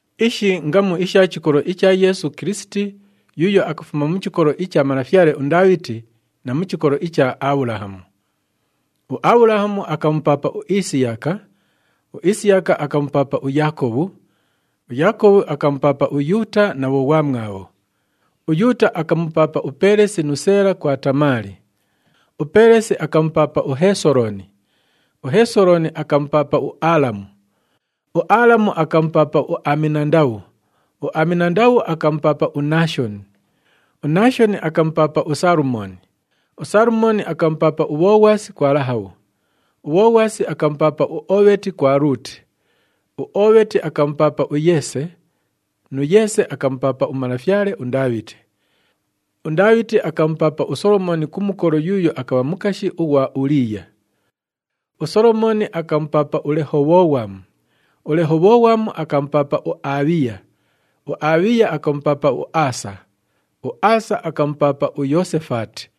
Ishi ngamu isha chikolo icha Yeesu Kilisiti yuuyo akafuma mu chikolo icha malafyale uNdaabhiti na mu chikolo icha Abhulahamu. UAbhulahamu akamupaapa uIsiyaka, uIsiyaka akamupaapa uYaakobhu, uYaakobhu akamupaapa uYuuta na bhoghwamwabho. UYuuta akamupaapa uPeelesi nu Seela kwa Tamaali. UPeelesi akamupaapa uHesolooni, uHesolooni akamupaapa uAalamu, uAalamu akamupaapa uAminandabhu, uAminandabhu akamupaapa uNaashoni, uNaashoni akamupaapa uSalumooni, uSalumooni akamupaapa uBhoghwasi kwa Lahabhu, uBhoghwasi akamupaapa uOobheti kwa Luuti, uOobheti akamupaapa uYeese, nu Yeese akamupaapa umalafyale uNdaabhiti. UNdaabhiti akamupaapa uSolomooni ku mukolo yuuyo akabha mukashi ghwa Uliiya, uSolomooni akamupaapa uLehobhoghwamu, uLehobhoghwamu akamupaapa uAbhiya, uAbhiya akamupaapa uAasa, uAasa akamupaapa uYoosefaati,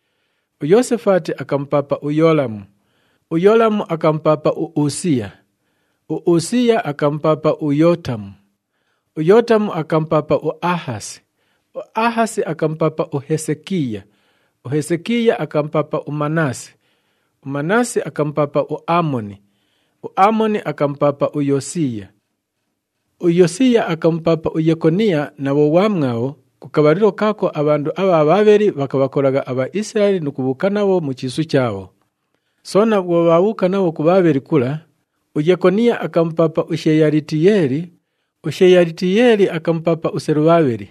uYoosefaati akamupaapa uYoolamu, uYoolamu akamupaapa uUsiiya, uUsiiya akamupaapa uYootamu, uYootamu akamupaapa uAhasi, uAhasi akamupaapa uHesekiiya, uHesekiiya akamupaapa uManaasi, uManaasi akamupaapa uAamoni, uAamoni akamupaapa uYosiiya. UYosiiya akamupaapa uYekoniya na bhoghwamwabho ku kabhalilo kaako abhandu abha Bhaabheli bhakabhakolagha aBhaisilaeli nu kubhuuka nabho mu chiisu chaabho. Soona bhwo bhaabhuuka nabho ku Bhaabheli kula, uYekoniya akamupaapa uSheyalitiyeeli, uSheyalitiyeeli akamupaapa uSelubhabheli,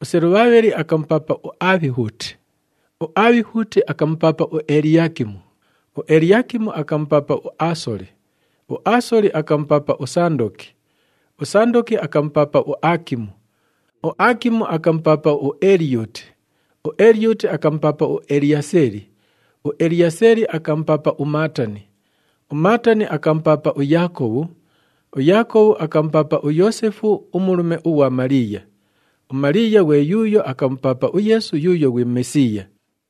uSelubhabheli akamupaapa uAbhihuti, uAbhihuti akamupaapa uEliyaakimu, uEliyaakimu akamupaapa uAasoli, uAasoli akamupaapa uSandoki, uSandoki akamupaapa uAakimu, uAakimu akamupaapa uEliyuti, uEliyuti akamupaapa uEliyaaseli, uEliyaaseli akamupaapa uMaatani, uMaatani akamupaapa uYaakobhu. UYaakobhu akamupaapa uYoosefu umulume ughwa Maliiya. UMaliiya ghwe yuuyo akamupaapa uYeesu yuuyo ghwi Mesiiya.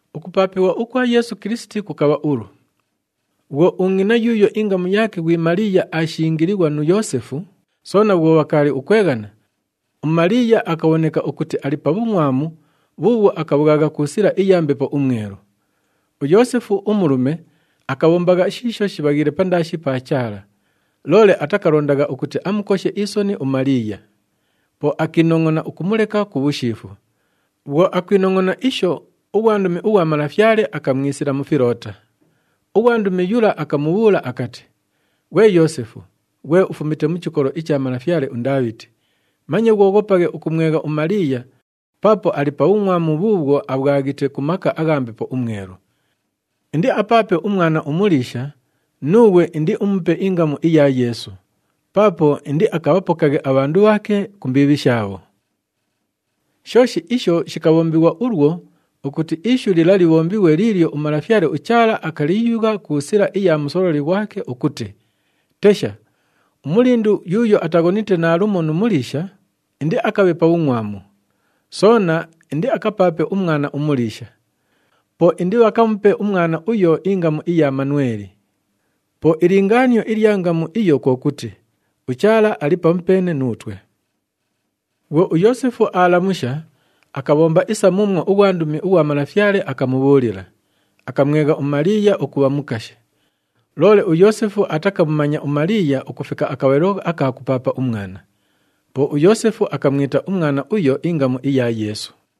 Ukupaapighwa ukwa Yeesu Kilisiti kukabha ulu. Bhwo ungʼina yuuyo ingamu yaake ghwi Maliiya aashingilighwa nu Yoosefu, soona bhwo bhakaali ukweghana, uMaliiya akabhoneka ukuti ali pa bhungʼwamu bhuubhwo akabhwagha ku sila iya Mbepo uMwelu. UYoosefu, umulume akabhombagha shiisho shibhaghiile pandaashi pa Chaala, loole atakalondagha ukuti amukoshe isoni uMaliiya. Po akiinongʼona ukumuleka ku bhushiifu. Bhwo akwinongʼona isho, ughwandumi ughwa Malafyale akamwisila mu filoota. Ughwandumi yula akamubhuula akati, “Ghwe Yoosefu, ghwe ufumite mu chikolo icha malafyale uNdaabhiti, manye ghwoghopaghe ukumwegha uMaliiya paapo ali pa bhungʼwamu bhuubhwo abhwaghite ku maka agha Mbepo uMwelu. Indiapaape umwana umuliisha, nuughwe indiumupe ingamu iya Yeesu, paapo indiakabhapokaghe abhandu bhaake ku mbiibhi shaabho.” Shooshi isho shikabhombighwa ulwo ukuti ishu lila libhombighwe liilyo uMalafyale uChaala akaliyugha ku sila iya musololi ghwake ukuti, “Tesha! Umulindu yuuyo ataghonite naalumo nu muliisha, indiakabhe pa bhungʼwamu. Soona indiakapaape umwana umuliisha! Po indibhakamupe umwana uyo ingamu iya Manweli.” Po ilingaanio ilya ngamu iyo kwo kuti, “UChaala ali pamupeene nuutwe.” Bhwo uYoosefu aalamusha, akabhomba isa muumwo ughwandumi ughwa Malafyale akamubhuulila, akamwegha uMaliiya ukubha mukashi. Loole uYoosefu atakamumanya uMaliiya ukufika akabhalilo aka kupaapa umwana. Po uYoosefu akamwita umwana uyo ingamu iya Yeesu.